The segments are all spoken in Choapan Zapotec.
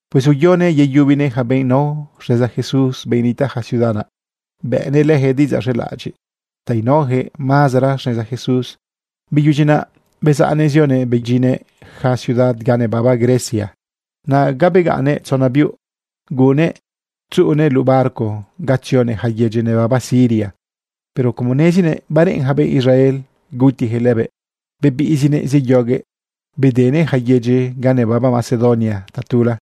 Pues uyonëꞌ yeyubinëꞌ yaca benꞌ nao xneza Jesús, benꞌ nitaꞌ ja ciudad naꞌ, bëꞌnëꞌ leyaquëꞌ diꞌidzaꞌ z̃elaꞌadyiꞌ ta inaoyaquëꞌ mazera xneza Jesús. Beyudyi naꞌ bezaꞌnëꞌ zioguëꞌ bedyinnëꞌ yaca ciudad ga nebaba Grecia. Naꞌ ga begaꞌnnëꞌ tzona biuꞌ. Guꞌunnëꞌ tzuꞌunëꞌ luꞌu barco ta tzionëꞌ yaca yedyi nebaba Siria, pero como nezinëꞌ bareꞌen yaca benꞌ Israel gutiyaquëꞌ lëbëꞌ, bebiꞌzinëꞌ zeyoguëꞌ bedenëꞌ yaca yedyi ga nebaba Macedonia tatula.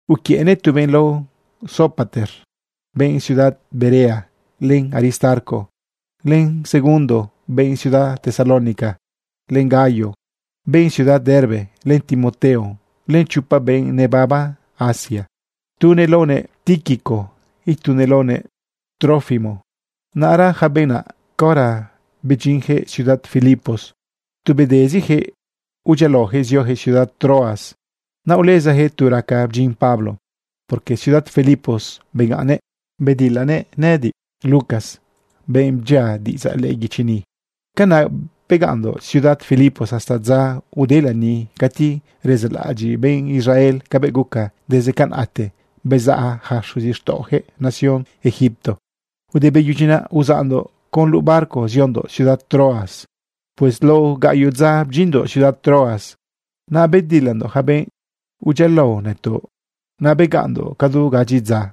Uquiëꞌnëꞌ tu benꞌ lao Sópater, benꞌ ciudad Berea, len Aristarco, len Segundo, benꞌ ciudad Tesalónica, len Gayo, benꞌ ciudad Derbe, len Timoteo, len chopa benꞌ nebaba Asia, tunëꞌ laonëꞌ Tíquico, itunëꞌ laonëꞌ Trófimo. Naꞌra yaca benꞌ naꞌ, caora bedyinyaquëꞌ ciudad Filipos, tu bedeziyaquëꞌ udyialaoyaquëꞌ zioyaquëꞌ ciudad Troas. Naꞌ ulezayaquëꞌ tu raca bdyin Pablo, porque ciudad Filipos begaꞌnnëꞌ bedilanëꞌ nëꞌëdiꞌ, Lucas, benꞌ bdyia diꞌidzaꞌ lëꞌë guichi ni. Canaꞌ begaꞌnndoꞌ ciudad Filipos hasta dza ude lani cati rezaꞌlaꞌadyiꞌ benꞌ Israel cabëꞌ guca desde canaꞌte bezaꞌ yaca xuzixtaꞌojëꞌ nación Egipto. Ude beyudyi naꞌ, uzaꞌndoꞌ con luꞌu barco ziondoꞌ ciudad Troas. Pues lao gaꞌyoꞌ dza bdyinndoꞌ ciudad Troas naꞌ, bedilandoꞌ yaca benꞌ udyialao nëtoꞌ. Naꞌ begaꞌnndoꞌ cadu gadyi dza.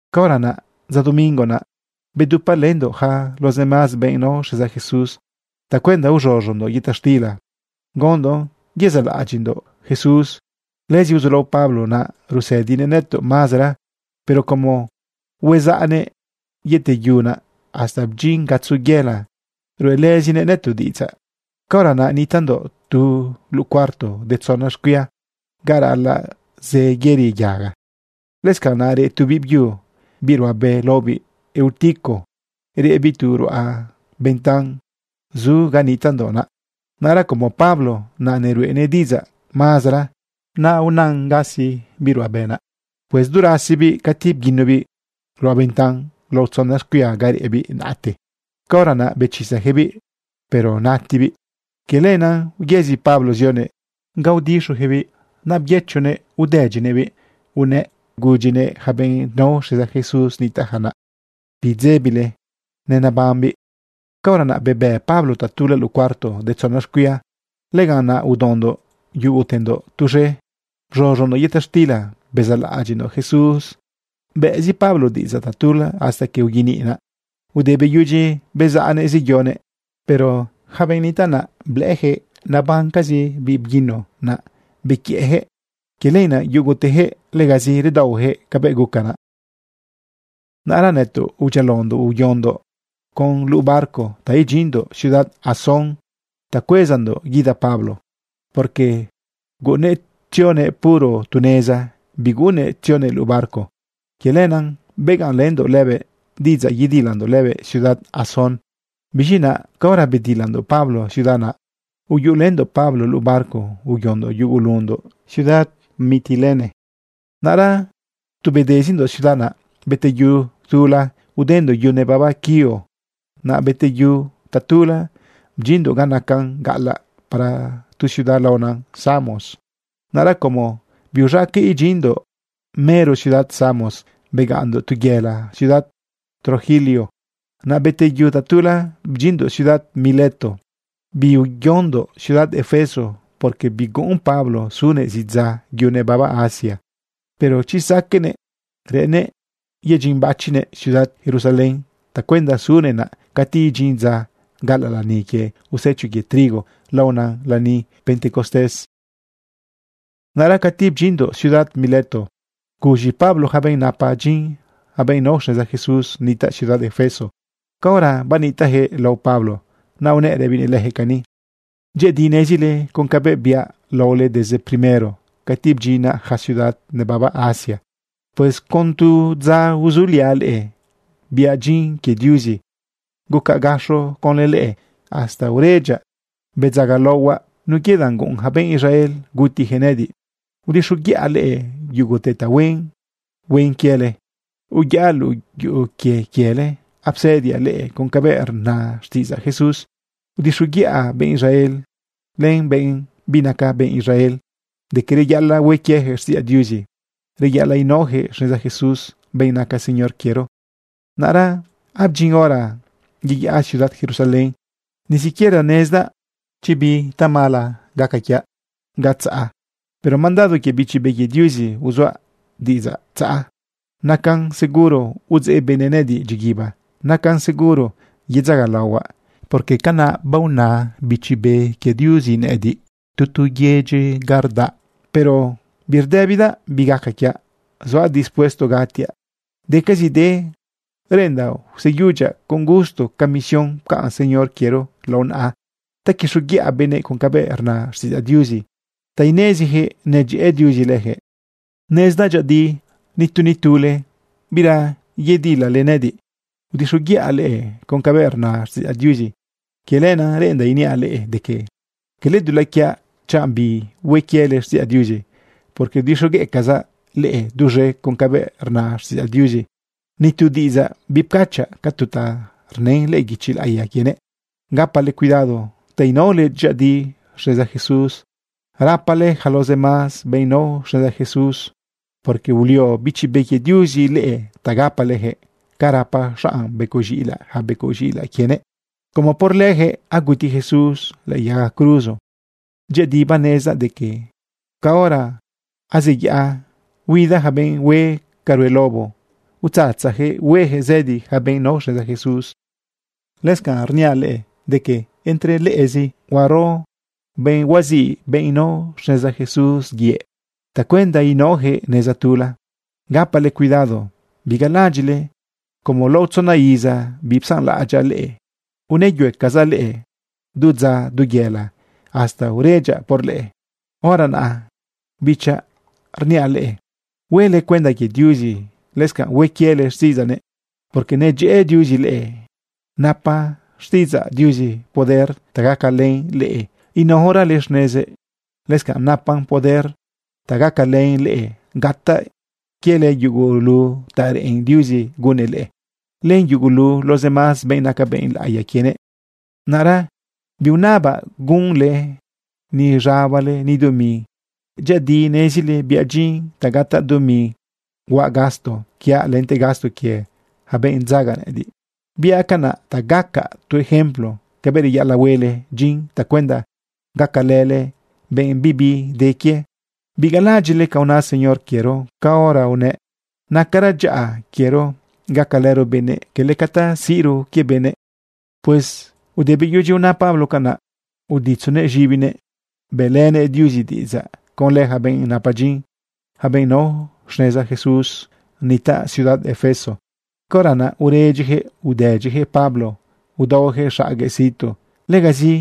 Caora naꞌ dza domingo naꞌ, bedupalëndoꞌ yaca los demás benꞌ nao xneza Jesús tacuenda uz̃uz̃undoꞌ yëta xtila gaondoꞌn yezaꞌlaꞌadyiꞌndoꞌ Jesús. Lëzi uzulao Pablo naꞌ rusëdinëꞌ nëtoꞌ mazera, pero como huezaꞌnëꞌ yeteyu naꞌ, hasta bdyin gatzo yëla ruꞌelëzinëꞌ nëtoꞌ diꞌidzaꞌ. Caora naꞌ nitaꞌndoꞌ tu luꞌu cuarto de tzona xcuia ga raꞌalaꞌ zë yëri yaga. Lëscanꞌ naꞌ reꞌ tu biꞌbyu, biꞌ ruꞌabe laobiꞌ Eutico. Reꞌbiꞌ tu ruꞌa bentan zu ga nitaꞌndoꞌ naꞌ. Naꞌra como Pablo naꞌ neruꞌenëꞌ diꞌidzaꞌ mazera, naꞌ unan gasi biꞌ ruꞌabe naꞌ. Pues du rasibiꞌ, cati bguinobiꞌ ruꞌa bentan lao tzona xcuia ga reꞌbiꞌ naꞌte. Caora naꞌ bechisayaquëꞌbiꞌ, pero natibiꞌ. Quie lenaꞌ uyëzi Pablo zionëꞌ ga udixojëꞌbiꞌ naꞌ byëchonëꞌ udëdyinëꞌbiꞌ unëꞌ gudyinëꞌ yaca benꞌ nao xneza Jesús nitaꞌja naꞌ: ―Bidzebile, nenebambiꞌ. Caora naꞌ, bebë Pablo tatula luꞌu cuarto de tzona xcuia. Lëganꞌ naꞌ udaondoꞌ yugutendoꞌ tuz̃e, bz̃uz̃undoꞌ yëta xtila bezaꞌlaꞌadyiꞌndoꞌ Jesús, bëꞌzi Pablo diꞌidzaꞌ tatula hasta que uyeniꞌ naꞌ. Ude beyudyinëꞌ bezaꞌnëꞌ zeyonëꞌ. Pero yaca benꞌ nitaꞌ naꞌ, blëꞌëyaquëꞌ nabamcazi biꞌ bguino naꞌ bequiëꞌyaquëꞌ. Quie lenaꞌ yugutejëꞌ legazi redaohueyaquëꞌ cabëꞌ guca naꞌ. Naꞌra nëtoꞌ udyialaondoꞌ uyondoꞌ con luꞌu barco ta idyinndoꞌ ciudad Asón ta cuezandoꞌ guida Pablo, porque guꞌunnëꞌ tzionëꞌ puro tu neza. Biguꞌunnëꞌ tzionëꞌ luꞌu barco. Quie lenaꞌ begaꞌnlëndoꞌ lëbëꞌ diꞌidzaꞌ yedilandoꞌ lëbëꞌ ciudad Asón. Biz̃i naꞌ caora bedilandoꞌ Pablo ciudad naꞌ, uyuꞌulëndoꞌ Pablo luꞌu barco uyondoꞌ yugulundoꞌ ciudad Mitilene. Naꞌra tu bedezindoꞌ ciudad naꞌ, beteyu tula, udendoꞌ yu nebaba Quío. Naꞌ beteyu tatula, bdyinndoꞌ ga nacan gaꞌalaꞌ para tu ciudad laona Samos. Naꞌra como biuz̃aqueꞌ idyinndoꞌ mero ciudad Samos, begaꞌnndoꞌ tu yëla ciudad Trogilio. Naꞌ beteyu tatula, bdyinndoꞌ ciudad Mileto. Biuyondoꞌ ciudad Efeso, porque biguꞌun Pablo sunëꞌ zidza yu nebaba Asia. Pero chi saqueꞌnëꞌ, reꞌennëꞌ yedyinbachinëꞌ ciudad Jerusalén tacuenda sunëꞌ naꞌ cati idyin dza gaꞌalaꞌ lani quie usecho quie trigo laonan lani Pentecostés. Naꞌra cati bdyinndoꞌ ciudad Mileto, guz̃i Pablo yaca benꞌ napa dyin, yaca benꞌ nao xneza Jesús nitaꞌ ciudad Efeso. Caora banitaꞌjëꞌ lao Pablo naꞌ unëꞌ rëbinëꞌ leyaquëꞌ cani: ―Dyëꞌëdi nezile con cabëꞌ biaꞌ laole desde primero cati bdyinaꞌ yaca ciudad nebaba Asia. Pues con catu dza uzuliaꞌ leꞌe, biaꞌ dyin quie Diuzi. Gucaꞌ gaxo conlë leꞌe hasta uredyaꞌ bedzagalaohuaꞌ nun quie danꞌ guꞌun ja benꞌ Israel gutiyaquëꞌ nëꞌëdiꞌ. Udixoguiꞌa leꞌe yugute ta huen huen quiele. Uyaꞌ luꞌu yuꞌu quie quiele apsëdiaꞌ leꞌe con cabëꞌ rna xtiꞌidzaꞌ Jesús. Udixoguiꞌa benꞌ Israel len benꞌ binaca benꞌ Israel de que reyaꞌalaꞌ hue quiejëꞌ xtiꞌidzaꞌ Diuzi, reyaꞌalaꞌ inaojëꞌ xneza Jesús, benꞌ naca Señor quiero. Naꞌra abdyin hora yeyaꞌa ciudad Jerusalén. Ni siquiera nezdaꞌ chanꞌ bi tamala gaca quiaꞌ ga tzaꞌa. Pero mandado quie Bichi Be quie Diuzi uzuaꞌ diꞌidzaꞌ tzaꞌa. Nacan seguro udzeꞌ benëꞌ nëꞌëdiꞌ dyiguiba. Nacan seguro yedzagalaohuaꞌ, porque canaꞌ baona Bichi Be quie Diuzi nëꞌëdiꞌ tu tu yedyi ga rdaꞌa. Pero birdëbidaꞌ bi gaca quiaꞌ. Zuaꞌ dispuesto gatiaꞌ. Decazide reꞌendaꞌ useyudyaꞌ con gusto ca comisión pcaꞌn Señor quiero lao naꞌa ta quixoguiꞌa benëꞌ con cabëꞌ rna xtiꞌidzaꞌ Diuzi ta ineziyaquëꞌ nedyëꞌë Diuzi leyaquëꞌ. ’Nezdaꞌ dyëꞌëdi nitu, nitule, bira yedilale nëꞌëdiꞌ. Udixoguiꞌa leꞌe con cabëꞌ rna xtiꞌidzaꞌ Diuzi. Quie lenaꞌ reꞌendaꞌ iniaꞌ leꞌe de que cala dulaꞌ quiaꞌ chanꞌ bihue quiele xtiꞌidzaꞌ Diuzi, porque udixogueꞌcazaꞌ leꞌe duz̃ete con cabëꞌ rna xtiꞌidzaꞌ Diuzi, nitu diꞌidzaꞌ bipcachaꞌ ca tu ta rnën lëꞌë guichi laꞌiya quienëꞌ. Gapale cuidado ta inaole dyëꞌëdi xneza Jesús. Rapale yaca los demás benꞌ nao xneza Jesús, porque ulio Bichi Be quie Diuzi leꞌe ta gapaleyaquëꞌ ca rapa xanꞌ becoꞌ z̃iꞌilaꞌ yaca becoꞌ z̃iꞌilaꞌ quienëꞌ, como por leyaquëꞌ aguti Jesús lëꞌë yaga cruzo. Dyëꞌëdi banezdaꞌ de que caora azeyaꞌa, huida yaca benꞌ hue ca rue lobo, utzatzayaquëꞌ hueyaquëꞌ zëdi yaca benꞌ nao xneza Jesús. Lëscanꞌ rniaꞌ leꞌe de que entre leꞌezi huaro benꞌ huaziꞌ benꞌ nao xneza Jesús yëꞌ tacuenda inaojëꞌ neza tula. Gapale cuidado. Bigalaꞌadyiꞌle como lao tzona iza bipsanlaꞌadyaꞌ leꞌe unëyuecazaꞌ leꞌe du dza, du yëla, hasta uredyaꞌ por leꞌe. ’Hora naꞌ, bichaꞌ, rniaꞌ leꞌe huele cuenda quie Diuzi, lëscanꞌ hue quiele xtiꞌidzaꞌnëꞌ, porque nedyëꞌë Diuzi leꞌe. Napa xtiꞌidzaꞌ Diuzi poder ta gacalën leꞌe inaorale xnezëꞌ. Lëscanꞌ napan poder ta gacalën leꞌe gataꞌ quiele yugulu ta reꞌen Diuzi gunnëꞌ leꞌe, len yugulu los demás benꞌ naca benꞌ laꞌiya quienëꞌ. Naꞌra biunabaꞌ gunle ni z̃abale, ni dumi. Dyëꞌëdi nezile biaꞌ dyin ta gataꞌ dumi huaꞌ gasto quiaꞌ lente gasto quie yaca benꞌ dzaga nëꞌëdiꞌ. Biaꞌ canaꞌ ta gaca tu ejemplo cabëꞌ reyaꞌalaꞌ huele dyin tacuenda gacalële benꞌ bibi de quie. Bigalaꞌadyiꞌle ca una Señor quiero caora unëꞌ: “Nacara dyaꞌa quiero gacalëro benëꞌ, quele ca ta siꞌro quie benëꞌ.” Pues ude beyudyi una Pablo canaꞌ, uditzonëꞌ z̃ibinëꞌ bëꞌlënëꞌ Diuzi diꞌidzaꞌ conlë yaca benꞌ napa dyin, yaca benꞌ nao xneza Jesús nitaꞌ ciudad Efeso. Caora naꞌ uredyiyaquëꞌ udedyiyaquëꞌ Pablo udaoyaquëꞌ xaguëꞌ situ. Legazi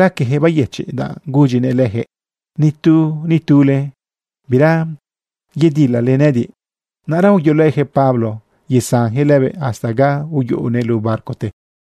raqueyaquëꞌ bayëchiꞌ, danꞌ gudyinëꞌ lejëꞌ: “Nitu, nitule, bira yedilale nëꞌëdiꞌ.” Naꞌra uyolëyaquëꞌ Pablo yesanjëꞌ lëbëꞌ hasta ga iyuꞌunëꞌ luꞌu barcote.